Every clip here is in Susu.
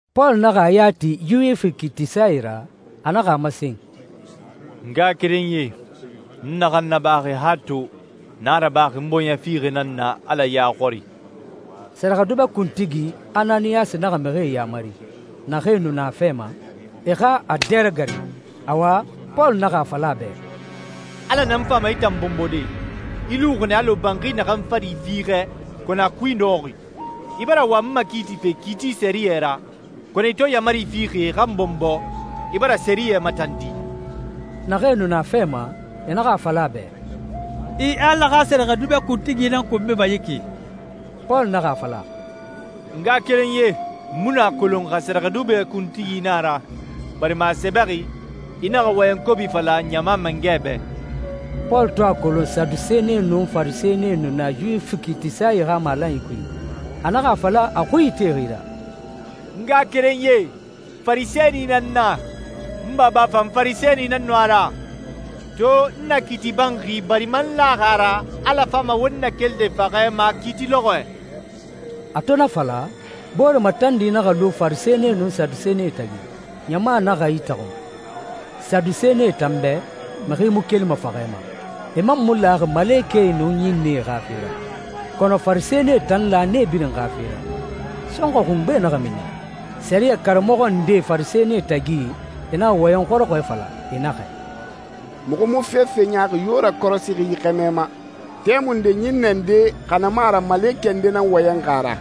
Pɔlu naxa a ya ti Yuwifi kiitisae ra. A naxa a masen, «N ngaxakerenyie, n naxan nabaxi han to, n a rabaxi n bɔɲɛ fiixɛ nan na Ala ya xɔri» Sɛrɛxɛdubɛ kuntigi, Ananiyasi naxa mixie yaamari, naxee nu na a fɛ ma, e xa a dɛ ragarin. Awa, Pɔlu naxa a fala a bɛ, «Ala nan fama i tan bɔnbɔde. I luxi nɛ alɔ banxi naxan fari fiixɛ kɔnɔ a kui nɔxɔxi. I bara wa n makiitife kiiti sɛriyɛ ra, kɔnɔ i to yaamari fixi e xa n bɔnbɔ, i bara sɛriyɛ matandi.» Naxee nu na a fɛ ma, e naxa a fala a bɛ, «I Ala xa sɛrɛxɛdubɛ kuntigi nan konbima yi ki!» Pɔlu naxa a fala, «N ngaxakerenyie, n mu nu a kolon xa sɛrɛxɛdubɛ kuntigi na a ra, barima a sɛbɛxi, ‹I naxa wɔyɛn kobi fala ɲama mangɛ bɛ.›» Pɔlu to a kolon Sadusenie nun Farisɛnie nu na Yuwifi kiitisae xa malanyi kui, a naxa a fala a xui itexi ra, «N ngaxakerenyie, Farisɛni nan n na. N baba fan Farisɛni nan nu a ra. To n na kiiti banxi barima n laxi a ra Ala fama won nakelide faxɛ ma kiiti lɔxɔɛ.» A to na fala, boore matandi naxa lu Farisɛnie nun Sadusenie tagi. Ɲama naxa itaxun. Sadusenie tan bɛ, mixi mu kelima faxɛ ma. E man mu laxi malekɛe nun ɲinnɛe xa fe ra. Kɔnɔ Farisɛnie tan la nee birin xa fe ra. Sɔnxɔɛ xungbe naxa mini. Sɛriyɛ karamɔxɔ ndee Farisɛnie tagi e naxa wɔyɛn xɔrɔxɔɛ fala. E naxɛ, «Muxu mu fefe ɲaaxi yo rakɔrɔsixi yi xɛmɛ ma. Tɛmunde ɲinnɛ nde, xa na mu a ra malekɛ nde, nan wɔyɛnxi a ra.»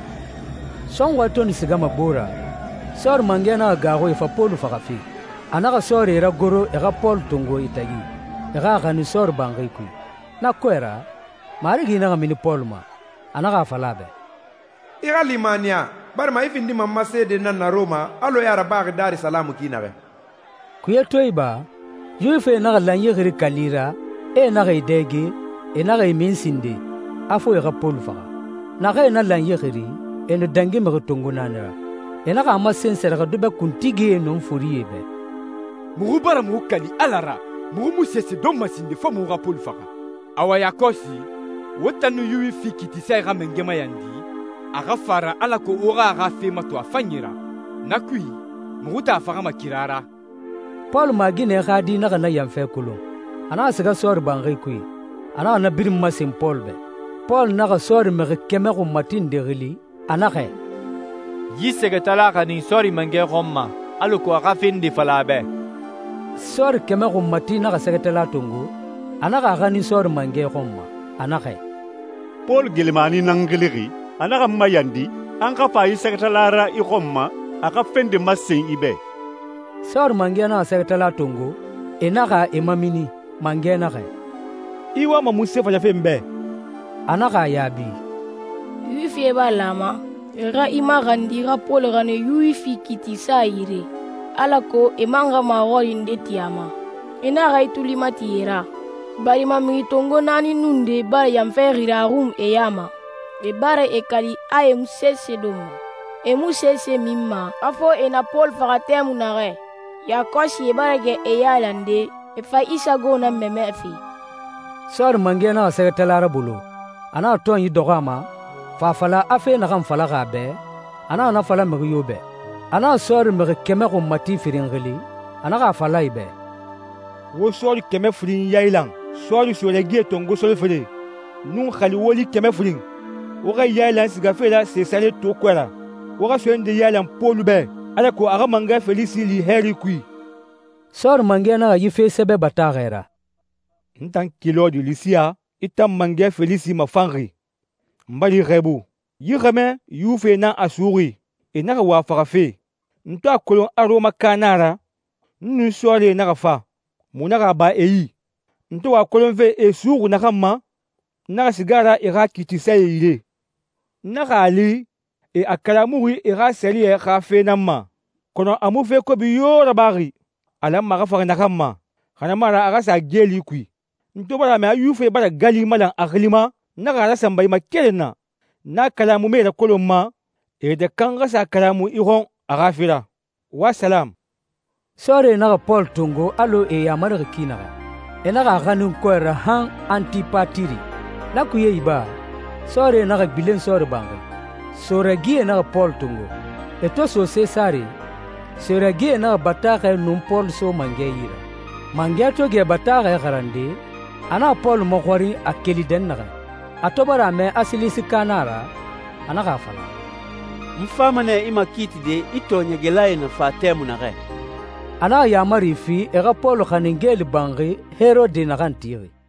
Sɔnxɔɛ to nu sigama gbo ra, sɔɔri mangɛ naxa gaaxu e fa Pɔlu faxafe. A naxa sɔɔrie ragoro e xa Pɔlu tongo e tagi, e xa a xanin sɔɔri banxi kui. Na kɔɛ ra, Marigi naxa mini Pɔlu ma. A naxa a fala a bɛ, «I xa limaniya barima i findima n ma seede nan na Rɔma alɔ i a rabaxi Darisalamu ki naxɛ.» Kuye to iba, Yuwifie naxa lanyi xiri kali ra, e naxa e dɛge, e naxa e min sinden, a fo e xa Pɔlu faxa. Naxee na lanyi xiri, e nu dangi mixi tongo naani ra. E naxa a masen sɛrɛxɛdubɛ kuntigie nun forie bɛ, «Muxu bara muxu kali Ala ra, muxu mu sese donma sinden fo muxu xa Pɔlu faxa. Awa, yakɔsi, wo tan nun Yuwifi kiitisae xa mangɛ mayandi a xa fa a ra alako wo xa a xa fe mato a fanyi ra. Na kui, muxu tan a faxama kira ra.» Pɔlu maaginɛ xa di naxa na yanfɛ kolon. A naxa siga sɔɔri banxi kui, a naxa na birin masen Pɔlu bɛ. Pɔlu naxa sɔɔri mixi kɛmɛ xunmati nde xili, a naxɛ, «Yi sɛgɛtala xanin sɔɔri mangɛ xɔn ma, alako a xa fe nde fala a bɛ.» Sɔɔri kɛmɛ xunmati naxa sɛgɛtala tongo, a naxa a xanin sɔɔri mangɛ xɔn ma. A naxɛ, «Pɔlu, geelimani nan n xilixi, a naxa n mayandi a n xa fa yi sɛgɛtala ra i xɔn ma, a xa fe nde masen i bɛ.» Sɔɔri mangɛ naxa sɛgɛtala tongo, e naxa e mamini. Mangɛ naxɛ, «I wama munse falafe n bɛ?» A naxa a yaabi, «Yuwifie bara lan a ma, e xa i maxandi i xa Pɔlu xanin Yuwifi kiitisae yire, alako e man xa maxɔrinyi nde ti a ma. I naxa i tuli mati e ra, barima mixi tongo naani nun nde bara yanfɛ xiri a xun e ya ma. E bara e kali a e mu sese donma, e mu sese minma a fo e na Pɔlu faxa tɛmui naxɛ. Yakɔsi e bara gɛ e yailande, e fa i sago nan mamɛfe.» Sɔɔri mangɛ naxa sɛgɛtala rabolo, a naxa tɔnyi dɔxɔ a ma, fa fala, a fe naxan falaxi a bɛ, a naxa na fala mixi yo bɛ. A naxa sɔɔri mixi kɛmɛ xunmati firin xili, a naxa a fala e bɛ, «Wo sɔɔri kɛmɛ firin yailan, sɔɔri soe ragie tongo solofere, nun xali woli kɛmɛ firin. Wo xa e yailan sigafe ra Sesare to kɔɛ ra. Wo xa soe nde yailan Pɔlu bɛ, alako a xa mangɛ Felisi li hɛɛri kui.» Sɔɔri mangɛ naxa yi fe sɛbɛ bataaxɛ ra. «N tan Kilɔdi Lisiya, i tan Mangɛ Felisi mafanxi, n bara i xɛɛbu. Yi xɛmɛ Yuwifie nan a suxuxi. E naxa wa a faxafe. N to a kolon a Rɔmaka na a ra, n nun sɔɔrie naxa fa, muxu naxa a ba e yi. N to wa a kolonfe e a suxuxi naxan ma, n naxa siga a ra e xa kiitisae yire. N naxa a li e a kalamuxi e xa sɛriyɛ xa fe nan ma, kɔnɔ a mu fe kobi yo rabaxi a lanma a xa faxa naxan ma, xa na mu a ra a xa sa geeli kui. N to bara a mɛ a Yuwifie bara gali malan a xili ma, n naxa a rasanba i ma keren na. N a kalamumae rakolonma e yɛtɛ kan xa sa a kalamu i xɔn a xa fe ra. Wo salamu.» Sɔɔrie naxa Pɔlu tongo alɔ e yamarixi ki naxɛ. E naxa a xanin kɔɛ ra han Antipatiri. Na kuye iba, sɔɔrie naxa gbilen sɔɔri banxi. Soe ragie naxa Pɔlu tongo. E to so Sesare, soe ragie naxa bataaxɛ nun Pɔlu so mangɛ yi ra. Mangɛ to gɛ bataaxɛ xarande, a naxa Pɔlu maxɔrin a keli dɛnnaxɛ. A to bara a mɛ a Silisika na a ra, a naxa a fala, «N fama nɛ i makiitide i tɔɔɲɛgɛlae na fa tɛmui naxɛ.» A naxa yaamari fi e xa Pɔlu xanin geeli banxi Herode naxan tixi.